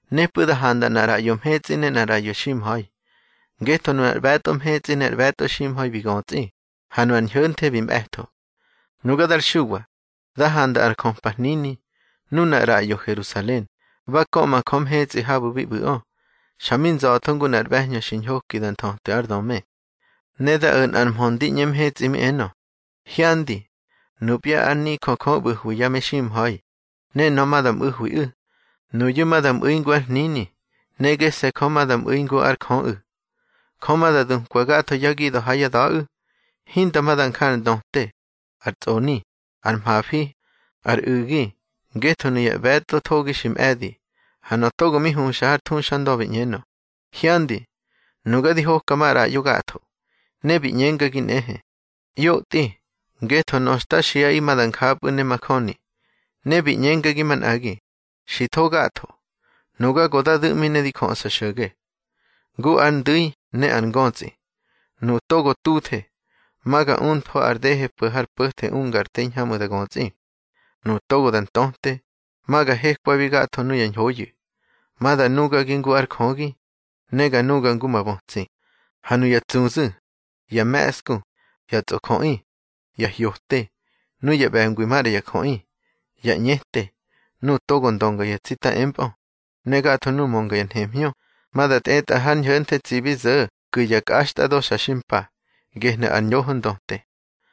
Nepꞌu̱ da handa nꞌar ꞌraꞌyo mhetsꞌi ne nꞌar ꞌraꞌyo ximha̱i, ngetho nunar ꞌbe̱tꞌo mhetsꞌi ne ar ꞌbe̱tꞌo ximha̱i bi götsꞌi, ha nu ar ñho̱nthe bi mꞌe̱tho. Nuga dar Xuwa, da handa ar jöpa hnini, nunar ꞌraꞌyo Herusalen, ba köꞌma Jö mhetsꞌi habu̱ bi ꞌbu̱ꞌö, xa mi nza̱tho ngu nꞌar ꞌbe̱hñö xi ñhoki da nthötwi ár döme. Ne da o̱ nꞌar mhö ndi ꞌñe mhetsꞌi mi enö: —Hyandi, nupya ár nijö Jö ꞌbu̱hwi ya meximha̱i, ne nöꞌö ma da mꞌu̱hwiꞌu̱. Nuyu̱ ma da mꞌu̱i ngu ár hnini, ne gese̱ Jö ma da mꞌu̱i ngu ár Jöꞌu̱. Jö ma da dukwa gatho yá gida̱ ha yá da̱ꞌu̱. Hinda ma da nja ar ndöte, ar tsꞌoni, ar mhafi, ar u̱gi, ngetho nuya ꞌbe̱tꞌo thogi xi mꞌe̱di. Ha nöꞌö togo mi huxa har thuxandö bi ꞌñenö: —Hyandi, nuga di hoka maꞌraꞌyo gatho. Ne bi ꞌñengagi nꞌehe: —ꞌYotꞌi, ngetho nöꞌö xta xiꞌaꞌi ma da njapꞌu̱ ne majöni. Ne bi ꞌñengagi manꞌagi: —Xi tho gatho. Nuga go da du̱ꞌmi ne di jöꞌsa xo̱ge, ngu ar ndu̱i ne ar ngötsꞌi. Nuꞌu̱ togo tuthe, ma ga umtho ar dehe po̱ har po̱the unga ar te hiñhamꞌu̱ da götsꞌi. Nuꞌu̱ togo da ntöte, ma ga hekwabi gatho nuya ñhoyu̱. Ma da nugagi ngu ár Jögi, ne ga nuga ngu ma bötsi. Ha nuya tsuzu̱, ya me̱ꞌsku, ya tsꞌojöꞌi, ya hyote, nuya ꞌbe̱ngwi maꞌra ya jöꞌi, ya ꞌñete, nuꞌu̱ togo ndönga yá tsita empꞌö, ne gatho nuꞌu̱ mönga ya nhemhñö, ma da tꞌetꞌa har ñho̱nthe tsibi zo̱ ku̱ ya kꞌaxtꞌado xa xi mpa. Gehnu̱ ar ñoho ndöte.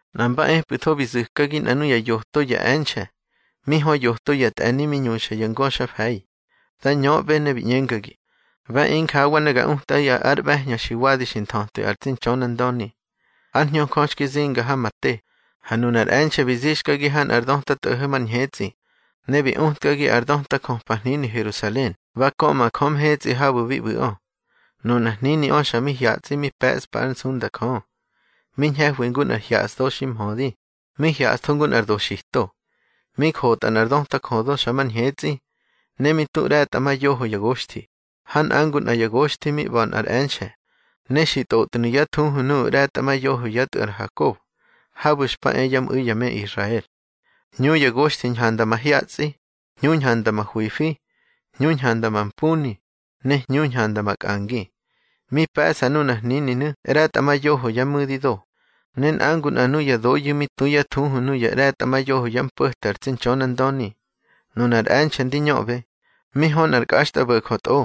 Nꞌa mba epꞌu̱tho bi zu̱kagi nꞌa nuya yoto ya e̱nxe̱ mi hö yoto yá tꞌe̱ni mi ñuxa ya ngöxa mfe̱i. Da ñöꞌbe ne bi ꞌñengagi: —Ba e injawa ne ga utꞌaꞌi ár ꞌbe̱hñö xi wadi xi nthötwi ar tsi Ntxönandöni. Ár Hñö Jö xki zinga ha ma te, ha nunar e̱nxe̱ bi zixkagi ha nꞌar döta tꞌo̱ho̱ mar ñhetsꞌi, ne bi utkagi ar döta jöpa hnini Herusalen ba köꞌma Jö mhetsꞌi habu̱ bi ꞌbu̱ꞌö. Nunar hniniꞌö xa mi hyatsꞌi mi pe̱ꞌspa ár nsunda Jö. Mi ñhe̱hwi ngu nꞌar hyaꞌsdo xi mhödi, mi hyaꞌstho ngu nꞌar doxito. Mi jotꞌa nꞌar döta jödo xa mar ñhetsꞌi, ne mi tu ꞌre̱tꞌamayoho ya goxthi, ha nꞌa ngu nꞌa ya goxthi mi ꞌba̱ nꞌar e̱nxe̱. Ne xi tꞌotnu̱ yá thuhu nuꞌu̱ ꞌre̱tꞌamayoho yá tꞌu̱ ar Hakob, habu̱ xpa e yá mꞌu̱i ya me Israel. Hñu ya goxthi ñhanda mahyatsꞌi, hñu ñhanda mahwifi, hñu ñhanda mampuni, ne hñu ñhanda makꞌangi. Mi pe̱ꞌsa nunar hnininu̱ ꞌre̱tꞌamayoho ya mu̱dido, ne nꞌa ngu nꞌa nuya doyu̱ mi tu yá thuhu nuya ꞌre̱tꞌamayoho yá mpo̱te ar tsi Ntxönandöni. Nunar e̱nxe̱ ndi ñöꞌbe, mi hö nꞌar kꞌaxtꞌabo̱jö tꞌo,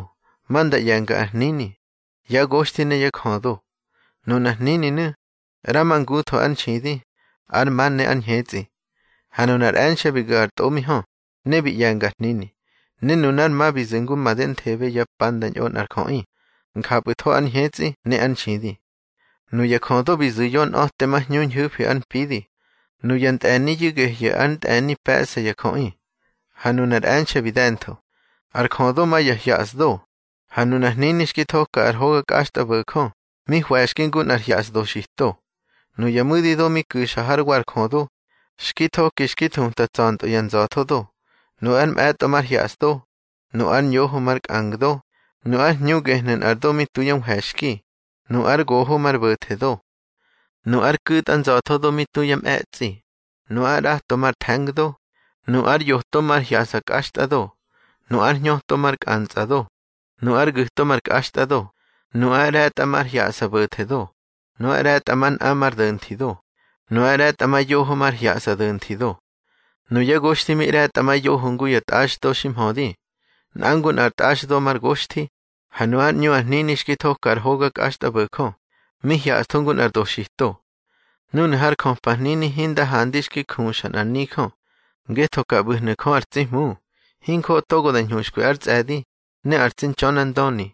ma nda ꞌye̱nga ar hnini, yá goxthi ne yá jödo. Nunar hnininu̱, ꞌramangutho ár nxidi, ár ma ne ár ñhetsꞌi. Ha nunar e̱nxe̱ bi gu̱ ar tꞌo mi hö, ne bi ꞌye̱nga ar hnini. Ne nunár ma bi zu̱ ngu madenthebe ya pa da ñꞌo nꞌar jöꞌi, njapꞌu̱tho ár ñhetsꞌi ne ár nxidi. Nuya jödo bi zu̱ yonꞌa̱temahñu ñhu̱fi ár mpidi. Nuya ntꞌe̱niyu̱ gehyu̱ ar ntꞌe̱ni pe̱ꞌsa ya jöꞌi, ha nunar e̱nxe̱ bi de̱ntho. Ar jödo ma ya hyasdo, ha nu ar hnini xki thoka ar hoga kꞌaxtꞌabo̱jö mi hwe̱xki ngu nꞌar hyaꞌsa doxito. Nuya mu̱dido mi ku̱xa hár wa ar jödo, xki thoki xki thuta tsa̱ntꞌö ya nza̱thodo. Nu ar mꞌe̱tꞌo mar hyaꞌsdo, nu ár ñoho mar kꞌangdo, nu ár hñu gehnu̱ nꞌar do mi tu yá nhwe̱xki, nu ár goho mar bo̱thedo. Nu ár ku̱tꞌa nza̱thodo mi tu ya mꞌe̱tsꞌi, nu ár ꞌrato mar the̱ngdo, nu ár yoto mar hyaꞌsa kꞌaxtꞌado, nu ár hñöto mar kꞌantsꞌado, nu ár gu̱to mar kꞌaxtꞌado, nu ár ꞌre̱tꞌa mar hyaꞌsa bo̱thedo, nu ár ꞌre̱tꞌamanꞌa mar do̱nthido, nu ár ꞌre̱tꞌamayoho mar hyaꞌsa do̱nthido. Nuyá goxthi mi ꞌre̱tꞌamayoho ngu ya tꞌaxdo xi mhödi. Nꞌa ngu nꞌa ar tꞌaxdo mar goxthi. Ha nu ár ꞌñu ar hnini xki thoka ar hoga kꞌaxtꞌabo̱jö, mi hyaꞌstho ngu nꞌar doxito. Núnu̱ har jöpa hnini hinda handa xki juxa nꞌar nijö, ngetho ka ꞌbu̱hnu̱ Jö ar tsi Hmu, hinjoꞌo togo da ñhuxkwi ár tsꞌe̱di, ne ar tsi Ntxönandöni,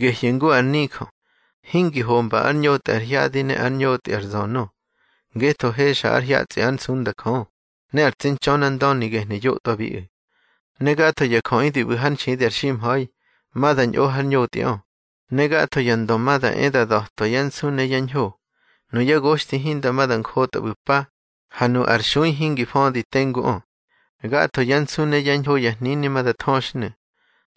gehyu̱ ngu ar nijö. Hingi homba ár ñotꞌi ar hyadi ne ár ñotꞌi ar zönö, ngetho hexa ar hyatsꞌi ár nsunda Jö, ne ar tsi Ntxönandöni gehnu̱ ꞌyotwabiꞌu̱. Ne gatho ya jöꞌi di ꞌbu̱ hár nxidi ar ximha̱i, ma da ñꞌo har ñotꞌiꞌö, ne gatho ya ndö ma da e da da̱twa yá nsu ne yá ñho. Nuyá goxthi hinda ma da njotꞌa ꞌbu̱ pa, ha nu ar xui hingi födi tenguꞌö. Gatho yá nsu ne yá ñho ya hnini ma da thöxhnu̱.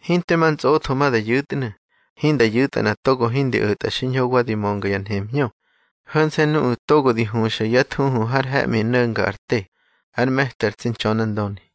Hinte ma ntsꞌotho ma da yu̱tnu̱, hinda yu̱tꞌa nꞌa togo hingi o̱tꞌa xiñho wa di mönga ya nhemhñö; ho̱nse̱ nuꞌu̱ togo di huxa yá thuhu har he̱ꞌmi no̱nga ar te, ár me̱ti ar tsi Ntxönandöni.